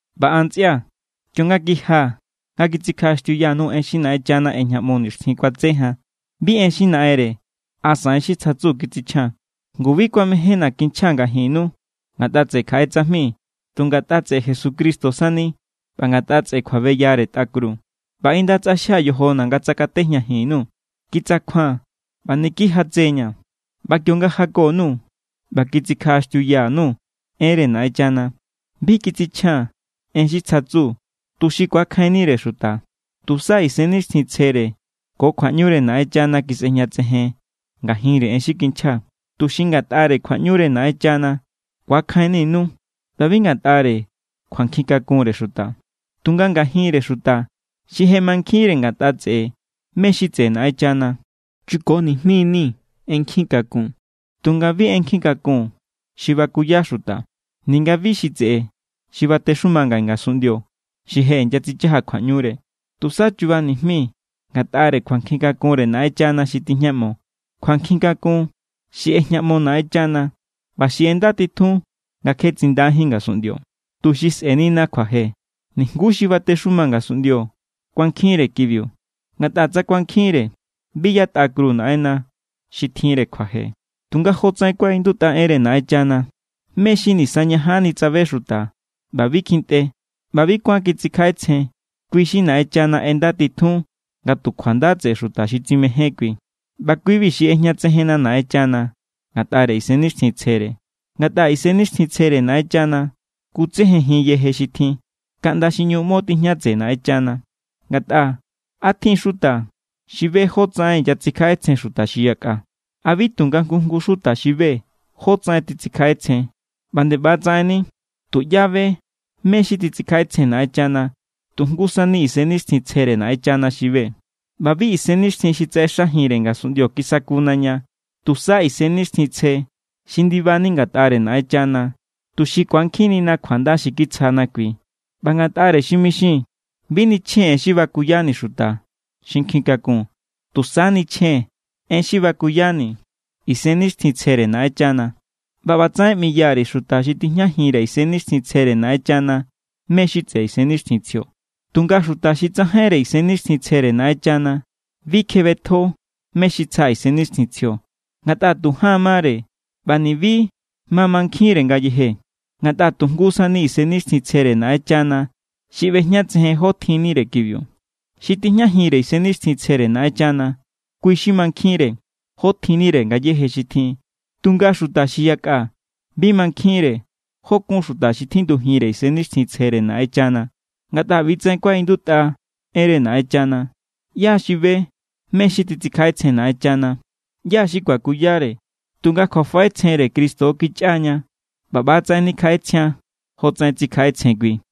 ꞌBa an, ntsꞌia̱, kionga kijia̱ nga kitsikjaꞌaxtiuya_nuu̱ en xi Naꞌenchana ꞌejñaꞌmo nixtjin kuatse jan, bi en xi naꞌenre asa en xi tsjatsu kitsichjaa̱n. Ngu, bi kuamejénna̱ kinchjaa̱ ngajinnu ngatꞌa tseꞌe kjaꞌe tsajmi, tu ngatꞌa tseꞌe Jesucristo sani ꞌba ngatꞌa tseꞌe kjuabeyare tꞌa kru. ꞌBa inda tsꞌaxjia̱ yojona̱ nga tsakatejñajin_nuu̱. Kitsakjua̱n ꞌba niki jatse=ña̱. ꞌBa kionga jako_nuu̱ ꞌba kitsikjaꞌaxtiuya_nuu̱ enre Naꞌenchana, bi kitsichjaa̱n en xi tsjatsu tuxi ku̱akjainnire xuta. Tusa Isennixtjintsjere ko kjuaꞌñure Naꞌenchana kisꞌejñatsejen ngajinre en xi kinchjaa̱, tuxi ngatꞌare kjuaꞌñure Naꞌenchana ku̱akjainninu ꞌba bi ngatꞌare kjuankjin kakunre xuta. Tunga ngajinre xuta xi je mankjinre ngatꞌa tseꞌe mé= xi tseꞌe Naꞌenchana, chuko nijmi=ni̱ en nkjin kakun, tunga bi en nkjin kakun xi bakuya xuta, ninga bi xi tseꞌe xi batexuma ngaꞌe ngasunꞌndio xi je inyatsichaja kjuaꞌñure. Tusa chuba nijmii̱ ngatꞌare kjuankjin kakunre Naꞌenchana xi tijñaꞌmo. Kjuankjin kakun xi ꞌejñaꞌmo Naꞌenchana ꞌba xi ꞌendatitjun nga kje tsindajín ngasunꞌndio, tuxi sꞌe̱nina kjuaje. Nijnguú xi batexuma ngasunꞌndio kuankjinre kibiu. Ngatꞌa tsa kuankjinre, bi yatꞌa kru Naꞌenna xi tjinre kjuaje. Tunga jotsaꞌen kuaꞌindutꞌa enre Naꞌenchana: “Mé xi nisañajanni tsabe xuta ꞌba bi kjintꞌe ꞌba bi kuán kitsikjaꞌetsjen, kui= xi Naꞌenchana ꞌendatitjun nga tu kjuanda tseꞌe xuta xi tsimején kui.” ꞌBa kui=bi xi ꞌejñatsejenna Naꞌenchana ngatꞌare Isennixtjintsjere. Ngatꞌa Isennixtjintsjere Naꞌenchana kutsejenjin yeje xi tjin, kaꞌnda xi ꞌñu ꞌmo tijña tseꞌe Naꞌenchana. Ngatꞌa, ¿a tjin= xuta xi be jótsaꞌen inyatsikjaꞌetsjen xuta xi yakꞌa? ¿A bi tu nga jngu jngu xuta xi be jótsaꞌen titsikjaꞌetsjen? ꞌBa nde ꞌba= tsaꞌenni tuꞌyá be mé= xi titsikjaꞌetsjen Naꞌenchana. Tu jngu sani Isennixtjintsjere Naꞌenchana xi be. ꞌBa bi isennixtjin xi tsaꞌexajinre ngasunꞌndio kisakuna ña, tusa Isennixtjintsje xi ndibani ngatꞌare Naꞌenchana, tuxi ku̱ankjinnina kjuanda xi kitsjana kui. ꞌBa ngatꞌare xi mixii̱n, bi nichjee̱n en xi bakuyani̱ xuta xi nkjin kakun, tusa nichjee̱n en xi bakuyani̱ Isennixtjintsjere Naꞌenchana. ꞌBa ꞌbatsaꞌen ꞌmiya_ri̱ xuta xi tijñajinre Isennixtjintsjere Naꞌenchana mé= xi tseꞌe Isennixtjintsjio. Tunga xuta xi tsajainre Isennixtjintsjere Naꞌenchana bi kjebetjo mé= xi tsja Isennixtjintsjio, ngatꞌa tu jaan mare. ꞌBa ni̱bi ma mankjinre ngayeje, ngatꞌa tu jngu sani Isennixtjintsjere Naꞌenchana xi ꞌbejñatsejen jó tjinnire kibiu. Xi tijñajinre Isennixtjintsjere Naꞌenchana, kui= xi mankjinre jó tjinnire ngayéje xi tjin. Tunga xuta xi yakꞌa bi mankjinre jó kun xuta xi tjindujinre Isennixtjintsjere Naꞌenchana. Ngatꞌa ꞌbi= tsaꞌen kuaꞌindutꞌa enre Naꞌenchana: “¿ꞌYá= xi be mé= xi titsikjaꞌetsjen Naꞌenchana? ¿ꞌYá= xi kuakuyare?” Tunga kjuafaꞌetsjenre Cristo kichꞌa ña, ꞌba ꞌbatsaꞌen nikjaꞌetsjian jotsaꞌen tsikjaꞌetsjen kui.